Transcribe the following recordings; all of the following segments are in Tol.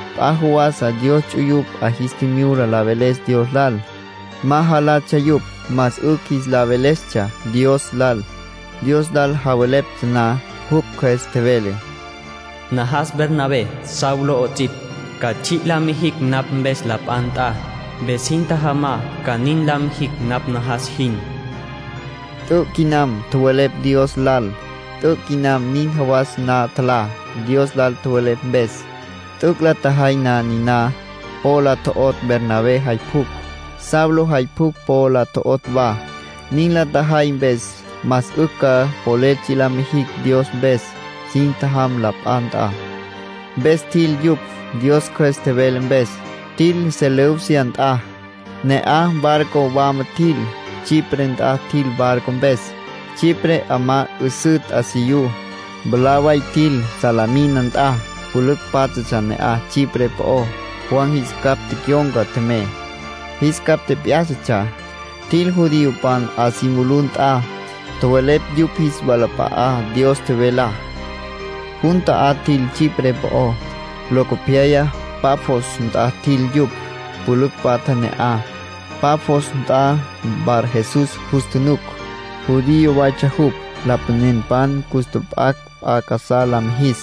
P'a jawasa Dios ts'uyupj 'a jis tjimyula la veles Dios lal. Ma jalatsja yupj, más 'ücj jis la velestsja Dios lal. Dios lal javeleptsja na, jupj Cjües tjevele: “Najas Bernabé, Saulo 'ots'ipj, ca tsji' la mijicj napj mpes la p'a nt'a. Mpes sin tjajamá ca nin la mijicj napj najas jin”, Dios Cjües nin tjevele. T'üc' quinam tjowelepj Dios lal. T'üc' quinam nin jawas ma tjalá, Dios lal tjowelepj mpes. T'üc' la tjajay na niná, po la tjo'otj Bernabé jay pjucj, Saulo jay pjucj po la tjo'otj wa. Nin la tjajay mpes más 'ücj ca polel tsji' la mijicj Dios mpes. Sin tjajam la p'a nt'a. Mpes tjil yupj, Dios Cjües tjevele mpes. Tjil Seleucia nt'a. Ne'aj barco wama tjil, Chipre nt'a tjil barco mpes. Chipre 'amá 'üsǘ t'asiyú. Mwalá way tjil Salamina nt'a, pülücj pátjatsja ne'aj Chipre po'ó. Juan jis capj tecyon̈ca tjemey, jis capj tjep'yá'satsja. Tjil judiopan 'a si mulú nt'a. Tjowelepj yupj jis walap'a'á Dios tjevelá. Jun ta'á tjil Chipre po'ó. Locopyaya Pafos nt'a tjil yupj. Pülücj patja ne'aj. Pafos nt'a Barjesús jus tjunuc. Judío waytsja jupj. Lapanenpan cus tjap'acj p'a casá la mijis,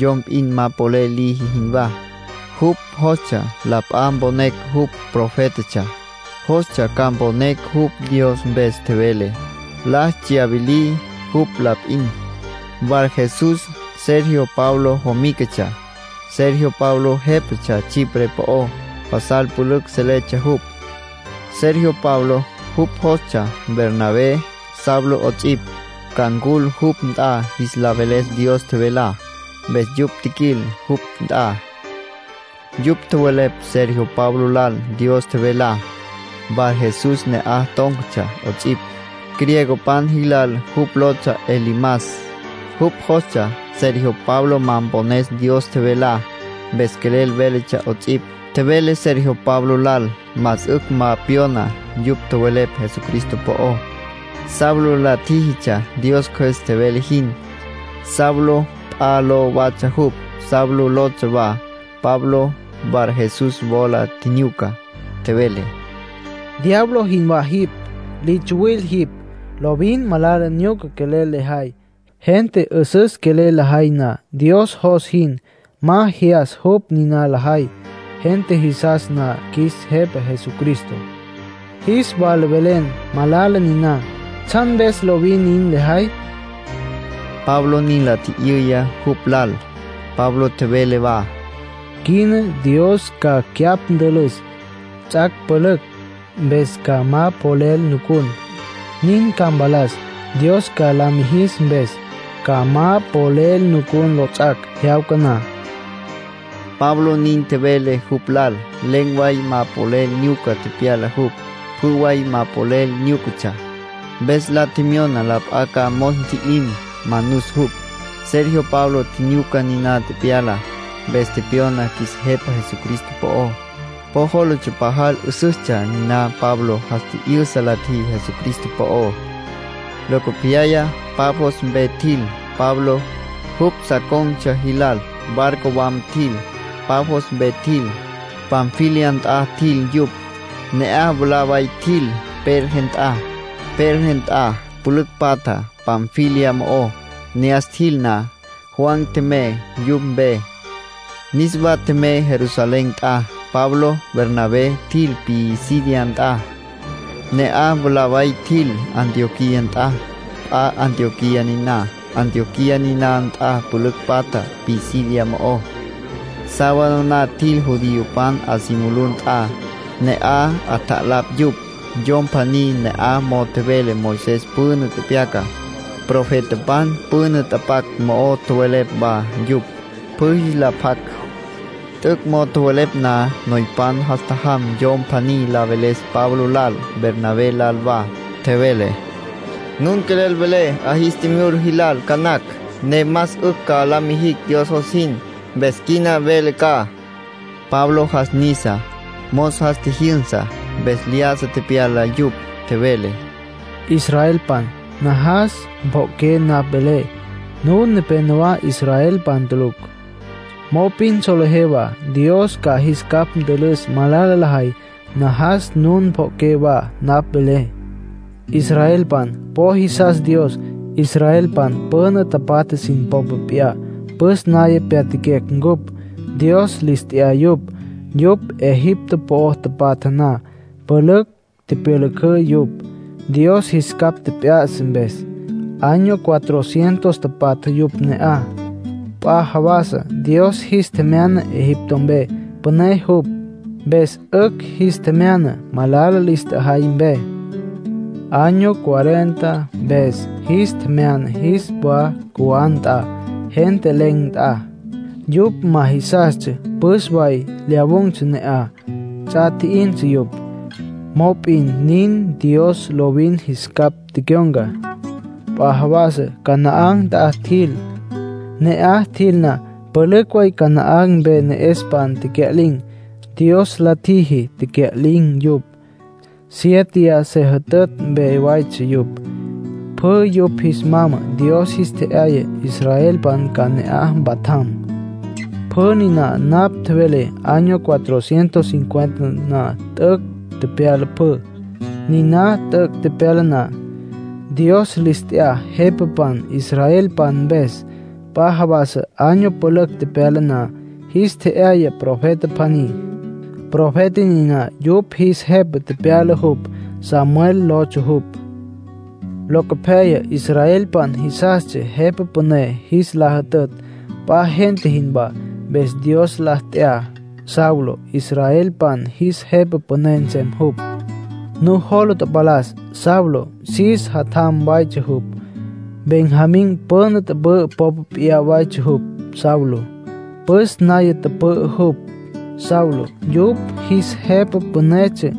yom p'in ma polel liji jinwá. Jupj jostsja la p'a mponecj jupj profétatsja, jostsja ca mponecj jupj Dios mpes tjevele. La tsyawilí jupj la p'in. Barjesús, Sergio Paulo jomícatsja. Sergio Paulo jépatsja Chipre po'ó. Pasal pülücj seletsja jupj, Sergio Paulo. Jupj jostsja Bernabé, Saulo 'ots'ipj, ca ncul jupj nt'a jis la veles Dios tjevelá. Mpes yupj tjiquil jupj nt'a. Yupj tjowelepj Sergio Paulo lal Dios tjevelá. Barjesús ne'aj tón̈catsja 'ots'ipj. (Griegopan jilal jupj lotsja Elimas.) Jupj jostsja Sergio Paulo ma mpones Dios tjevelá. Mpes quelel véletsja 'ots'ipj. Tjevele Sergio Paulo lal más 'ücj ma pyona yupj tjowelepj Jesucristo po'ó. Saulo la tjíjitsja Dios Cjües tjevele jin. Saulo p'a ló watsja jupj, Pablo lotsja wa. Pablo Barjesús wola tjinyuca. Tjevele: “Diablo jinwá le jay jipj. Li tsuwil jipj. Lovin malala nyuca quelel lejay. Gente 'üsüs quelel lajay na Dios jos jin, ma jyas yupj nin lajay. Gente jisas na qjuis Jepa Jesucristo, jis wala velen malala niná. ¿Tsjan mpes lovin nin lejay?” Pablo nin la tji'yüya jupj lal. Pablo tjevele wa: “Quina Dios ca cyapj ntülüs. Ts'ac' pülücj mpes ca ma polel nucun, nin ca mpalas, Dios ca la mijis mpes. Ca ma polel nucun lots'ac' jyawca na”, Pablo nin tjevele jupj lal. Len̈ way ma polel nyuca tepyala jupj. Pjü way ma polel nyúcatsja. Mpes la tjemyona la p'a ca mos ntji'lim, manus jupj. Sergio Paulo tjinyuca niná tepyalá. Mpes tepyona qjuis Jepa Jesucristo po'ó. Po jólatsja pajal 'üsüstsja niná Pablo jas tji'yüsa la tjiji Jesucristo po'ó. Locopyaya Pafos mpe tjil. Pablo, jupj sa con̈tsja jilal, barco wama tjil. Pafos mpe tjil, Panfilia nt'a tjil yupj. Ne'aj mwalá way tjil Perge nt'a. Perge nt'a pülücj patja Panfilia mo'ó. Ne'as tjil na, Juan tjemey yupj mpe. Niswa tjemey Jerusalén nt'a. Pablo, Bernabé, tjil Pisidia nt'a. Ne'aj mwalá way tjil Antioquía nt'a. (P'a Antioquía niná.) Antioquía niná nt'a pülücj patja Pisidia mo'ó. Sábado na tjil judiopan 'a si mulú nt'a, ne'aj 'atjalapj yupj. Yom pjaní ne'aj mo'o tjevele Moisés püna tepyacá, profetapan püna tapac mo'o tjowelepj wa yupj, pjü jis la pjac. T'üc' mo'o tjowelepj na, noypan jas tjajam yom pjaní la veles Pablo lal, Bernabé lal wa. Tjevele: “Nun quelel welé 'a jis tjimyula jilal ca nacj, ne más 'ücj ca la mijicj Dios jos jin. Mpes quina mvelé ca.” Pablo jas nisa. Mos jas tjijyünsa, mpes lyájasa tepyala yupj. Tjevele: “Israelpan, najas pjo'oqué napj velé. Nun nepénowa israelpan tulucj, mop'in solejé wa Dios ca jis capj ntülüs malala lajay. Najas nun pjo'oqué wa napj velé. Israelpan po jisas Dios. Israelpan püna tapatja sin popa p'iyá püs naya pyatjaquecj cupj. Dios lis t'ya yupj. Yupj Egipto po'o tapatja na, pülücj tipyülücǘ yupj, Dios jis capj tjep'ya'sa mpes. Año cuatro cientos tapatja yupj ne'aj. P'a jawasa Dios jis tjemyana Egipto mpe. Püné jupj, mpes 'ücj jis tjemyana malala lis tjajay mpe. Año cuarenta mpes jis tjemyana jis wa cjuwá nt'a, gente len̈ nt'a. Yupj ma jisastsja püs way lyawun̈tsja ne'aj; ts'a tji'in yupj, mop'in nin, Dios lovin jis capj tecyon̈ca. P'a jawasa Canaán nt'a tjil. Ne'aj tjil na, pülücj Canaán mpe ne'espan tecya'lin̈, Dios la tjiji tecya'lin̈ yupj. Siéteya se jütütj mpe waytsja yupj. Pjü yupj jis mama Dios jis tje'yaya israelpan ca ne'aj mpatjam. Pjü niná napj tjevelé año cuatro cientos cincuenta na t'üc' tepyala pjü. ”Niná t'üc' tepyala na, Dios lis t'ya jepapan israelpan mpes. P'a jawasa, año pülücj tepyala na, jis tje'yaya profeta pjaní. Profeta niná yupj jis jepa tepyala jupj. Samuel lotsja jupj. Locopyaya israelpan jisastsja jepa püné jis la jütütj, p'a gente jinwá. Mpes Dios la t'ya Saulo, israelpan jis jepa püné nsem jupj. Nujola tapalas Saulo Cis jatjam waytsja jupj. Benjamín püna tüpü'ü popa p'iyá waytsja Saulo; püs naya tüpü'ü jupj. Saulo yupj jis jepa pünetsja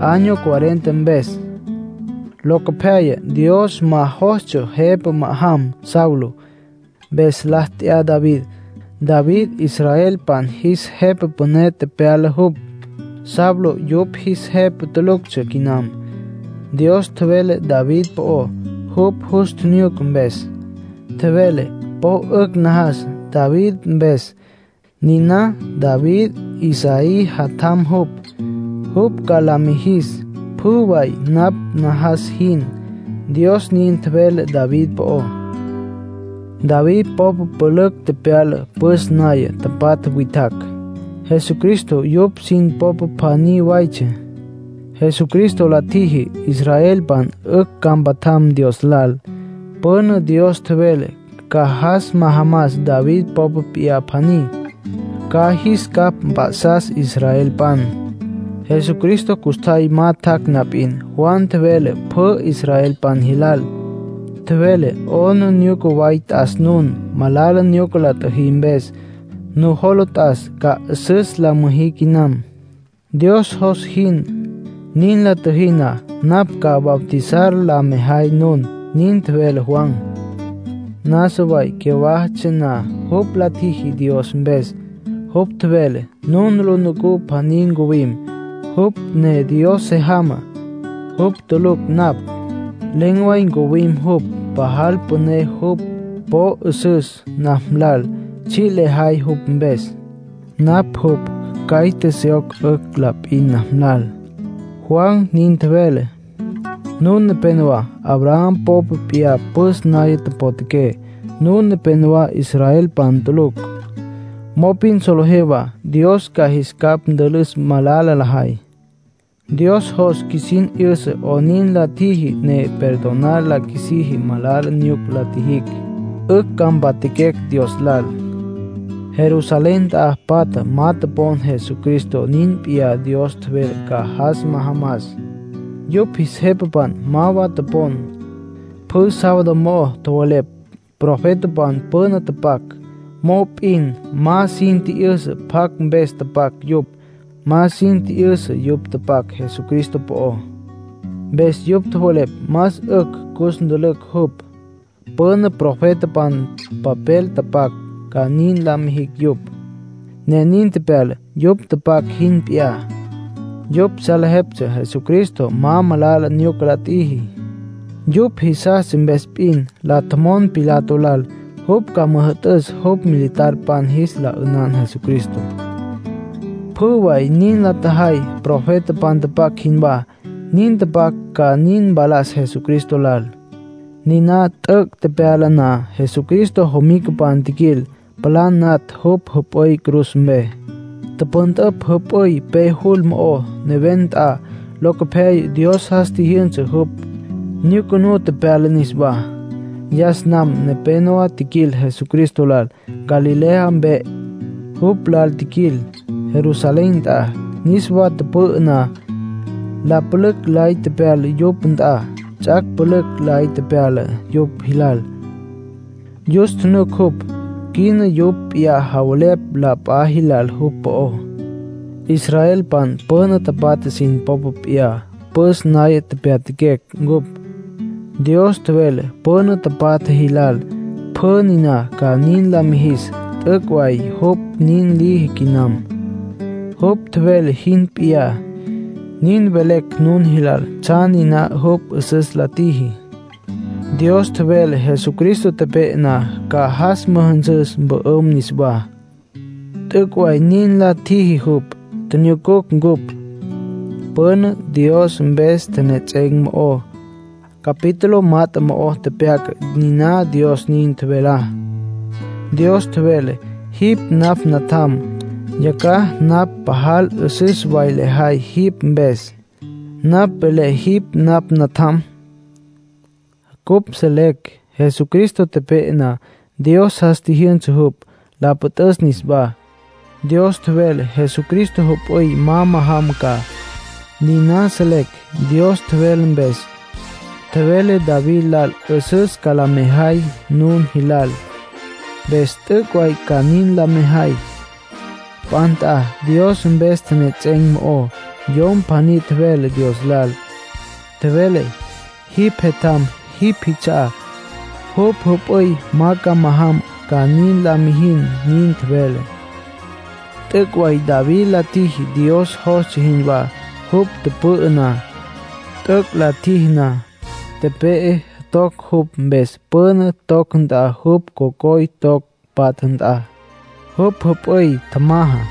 año cuarenta mpes. Locopyaya Dios ma jostsja jepa ma'ajam Saulo. Mpes la t'ya David, David israelpan jis jepa püné tepyala jupj. Saulo yupj jis jepa tuluctsja quinam. Dios tjevele David po'ó jupj jus tjinyuca mpes. Tjevele: ‘Po 'ücj najas David mpes, niná David Isaí jatjam jupj. Jupj ca la mijis pjü way napj najas jin’, Dios nin tjevele David po'ó. David popa pülücj tepyala, püs naya tapatja witjacj, Jesucristo yupj sin popa pjaní waytsja. Jesucristo la tjiji israelpan 'ücj ca mpatjam Dios lal. Püna Dios tjevele ca jas majamas David popa p'iyá pjaní, ca jis capj mp'a'sas israelpan. ”Jesucristo custjay ma tjac' na p'in, Juan tjevele pjü israelpan jilal. Tjevele: ‘'Aplijila way t'as nun, malala nyuca la tjüjí mpes. Nujola t'as ca 'üsüs la müjí quinam, Dios jos jin. Nin la tjüjí na, napj ca bautizar la mejay nun’, nin tjevele Juan. Nasa way cyawájatsja na jupj la tjiji Dios mpes, jupj tjevele: ‘Nun lu nucú pjaní ncuwim, jupj ne Dios se jamá. Jupj tulucj napj. Len̈ way ncuwim jupj. Pajal püné jupj. Po 'üsüs napj lal tsji' lejay jupj mpes. Napj jupj caite syoc la p'in 'ücj napj lal’, Juan nin tjevele. ”Nun nepénowa Abraham popa p'iyá püs naya potjaqué. Nun nepénowa israelpan tulucj, mop'in solejé wa Dios ca jis capj ntülüs malala lajay. Dios jos qjuisin 'yüsa 'onin la tjiji ne perdonar la qjuisiji malala nyuca la tjijicj, 'ücj ca mpatjaquecj Dios lal. Jerusalén nt'a patja ma topon Jesucristo niná p'iyá Dios tjevele ca jas majamas. Yupj jis jepapan ma wa topon. Pjü sábado mo'o tjowelepj profetapan püna tapac, mop'in ma sin tji'yüsa pjacj mpes tapac yupj. Ma sin tji'yüsa yupj tapac Jesucristo po'ó. Mpes yupj tjowelepj más 'ücj cus ntülücj jupj. Püna profetapan papel tapac ca nin la mijicj yupj, ne nin tepyala, yupj tapac jin p'iyá. Yupj salejeptsja Jesucristo ma malala nyuca la tjiji. Yupj jisastsja mpes p'in la tjomon Pilato lal jupj ca müjü'tüs jupj militarpan jis la 'ünan Jesucristo. ”Pjü way nin la tjajay profetapan tapac jinwá, nin tapac ca nin mpalas Jesucristo lal. Niná t'üc' tepyala na, Jesucristo jomicapan tjiquil, palá natj jupj jüp'üy cruz mpe. Tüpüntüpj jüp'üy pe jul mo'ó, neven nt'a. Locopyaya Dios jas tjijyünsa jupj, nyucunú tepyala niswá. Yas nam nepénowa tjiquil Jesucristo lal Galilea mpe, jupj lal tjiquil Jerusalén nt'a. Niswa tüpü'ü na, la pülücj lay tepyala yupj nt'a. Ts'ac' pülücj lay tepyala yupj jilal. Jus tjunuc jupj. Quina yupj p'iyá javelepj la p'a jilal jupj po'ó. ”Israelpan püna tapatja sin popa p'iyá püs naya pyatjaquecj cupj. Dios tjevele püna tapatja jilal pjü niná ca nin la mijis. T'üc' way jupj nin liji quinam, jupj tjevele jin p'iyá. Nin velecj nun jilal tsjan niná jupj 'üsüs la tjiji. Dios tjevele Jesucristo tepe'e na ca jas müjünsüs, mpü'üm niswá. T'üc' way nin la tjiji jupj. Tjinyucucj cupj. Püna Dios mpes tjenejets'en̈ mo'ó, capítulo mat'e mo'ó tepyaca niná Dios nin tjevelá. Dios tjevele: ‘Jipj napj Natjam. Yacjaj napj pajal 'üsüs way lejay jipj mpes, napj velé jipj napj natjam.’ Cupj selecj Jesucristo tepe'e na, Dios jas tjijyünsa jupj, la püt'üs niswá. Dios tjevele Jesucristo jüp'üy ma majam ca. Niná selecj Dios tjevele mpes: ‘Tjevelé David lal 'üsüs ca la mejay nun jilal. Mpes t'üc' way ca nin la mejay.’ P'a nt'a, Dios mpes tjenejets'en̈ mo'ó, yom pjaní tjevele Dios lal. Tjevele: ‘Jipj Jetjam jipj jits'a'á. Jupj jüp'üy ma ca majam, ca nin la mijin’, nin tjevele. T'üc' way David la tjiji Dios jostsja jinwá jupj tüpü'ü na. T'üc' la tjiji na, tepe'e. Toc jupj mpes, püna toc nt'a jupj cocoypan toc patja nt'a. Jupj jüp'üy tjamaja.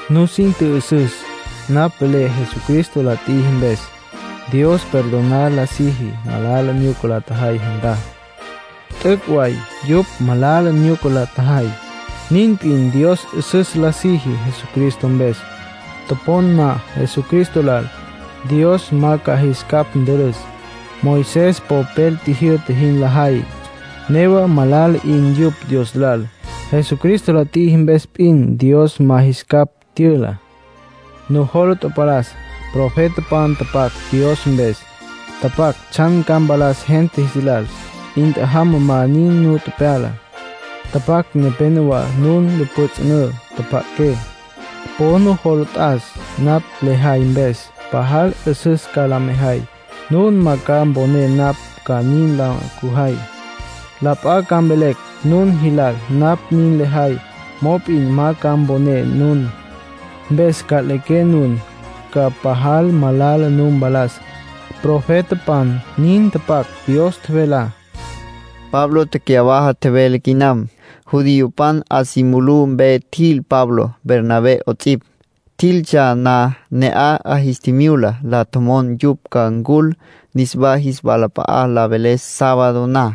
Nusin tjü'üsüs napj velé. Jesucristo la tjiji mpes, Dios perdonar la siji malala nyuca la tjajay gentá. T'üc' way yupj malala nyuca la tjajay. Nin p'in Dios 'üsüs la siji Jesucristo mpes. Topon na Jesucristo lal, Dios ma ca jis capj ntülüs. Moisés popel tjijyü'ta jin lajay, newa malala 'in yupj Dios lal. Jesucristo la tjiji mpes p'in Dios ma jis capj tyüla. Nujola tapalas profetapan tapac Dios mpes. Tapac tsjan ca mpalas gente jis lal. 'In tjajamá ma nin nu pyala. Tapac: ‘Nepénowa nun lu pjüts'ünǘ. Tjapja'aqué. Po nujola t'as napj lejay mpes. Pajal 'üsüs ca la mejay. Nun ma ca mponé napj ca nin la cüjay. La p'a ca mvelecj nun jilal napj nin lejay, mop'in ma ca mponé nun. Mpes nca'liqué nun, ca pajal malala nu mpalas.’ Profetapan nin tapac Dios tjevelá.” Pablo tecyawaja tjevele quinam. Judiopan 'a si mulú mpe tjil Pablo, Bernabé 'ots'ipj. Tjiltsja na, ne'aj 'a jis tjimyula la tjomon yupj ca ncul niswá jis walap'a'a la veles sábado na.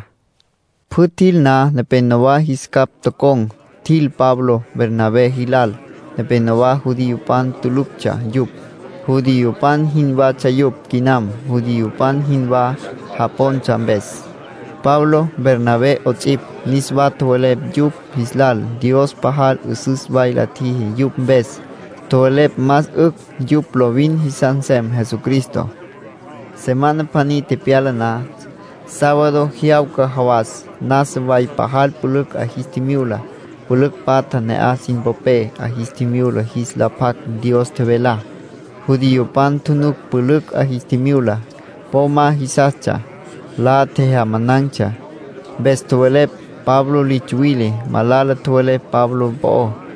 Pjü tjil na, nepénowa jis capj tocon̈, tjil Pablo, Bernabé jilal. Nepenowá judiopan tuluctsja yupj; judiopan jinwatsja yupj quinam, judiopan jinwá japontsja mpes. Pablo, Bernabé 'ots'ipj, niswa tjowelepj yupj jis lal Dios pajal 'üsüs way la tjiji yupj mpes. Tjowelepj más 'ücj yupj lovin jisas nsem Jesucristo. Semana pjaní tepyala na, sábado jyawca jawas nasa way pajal pülücj 'a jis tjimyula, pülücj patja ne'aj sin popé. 'A jis tjimyula jis la pjac Dios tjevelá. Judiopan tjunuc pülücj 'a jis tjimyula. Po ma jisastsja. La tjejyamanan̈tsja. Mpes tjowelepj Pablo li tsuwile. Malala tjowelepj Pablo po'ó.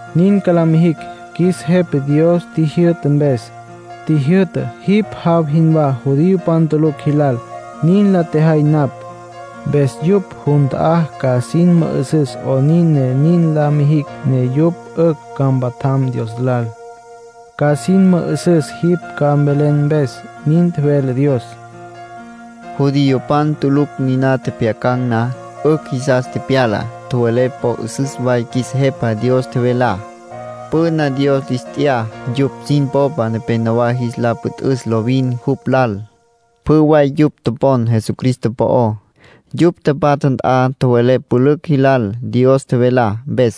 Nin ca la mijicj qjuis Jepa Dios qjuis tjijyü'ta mpes. Tjijyü'ta: ‘Jipj jaw jinwá judiopan tulucj jilal, nin la tjejay napj. Mpes yupj jun ta'á ca sin mü'üsüs 'onin ne nin la mijicj ne yupj 'ücj ca mpatjam Dios lal. Ca sin mü'üsüs jipj ca mvelen mpes,’ nin tjevele Dios.” Judiopan tulucj niná tjepjyacan̈ na, 'ücj jisas tepyala. Tjowelepj po 'üsüs way qjuis Jepa Dios tjevelá. Püna Dios lis t'ya yupj sin popa nepenowá jis la püt'üs lovin jupj lal. Pjü way yupj topon Jesucristo po'ó. Yupj tapatja nt'a tjowelepj pülücj jilal Dios tjevelá mpes.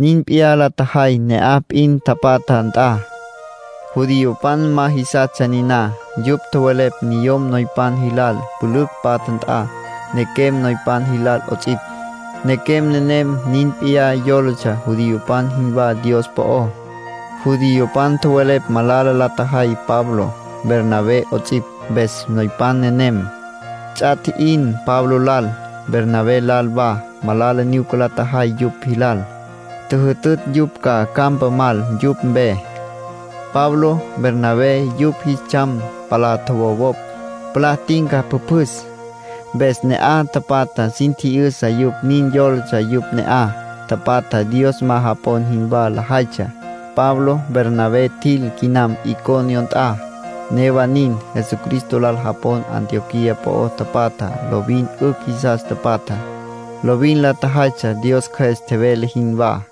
Nin p'iyá la tjajay ne'aj p'in tapatja nt'a. Judiopan ma jisastsja niná. Yupj tjowelepj niyom noypan jilal pülücj patja nt'a, nequem noypan jilal 'ots'ipj. Nequem nenem nin p'iyá yólatsja judiopan jinwá Dios po'ó. Judiopan tjowelepj malala la tjajay Pablo, Bernabé 'ots'ipj. Mpes noypan nenem, ts'a tji'in Pablo lal, Bernabé lal wa. Malala nyuca la tjajay yupj jilal. Tjüjütütj yupj ca campa mal yupj mpe. Pablo, Bernabé, yupj jis tsjam palá tjowowopj, palá tinca pjüpjüs. Mpes ne'aj tapatja sin tji'yüsa yupj nin yólatsja yupj ne'aj tapatja Dios ma japon jinwá lajaytsja. Pablo, Bernabé, tjil quinam Iconio nt'a. Newa nin, Jesucristo lal japon Antioquía po'o tapatjá lovin 'ücj jisas tapatja, lovin la tjajaytsja Dios Cjües tjevele jinwá.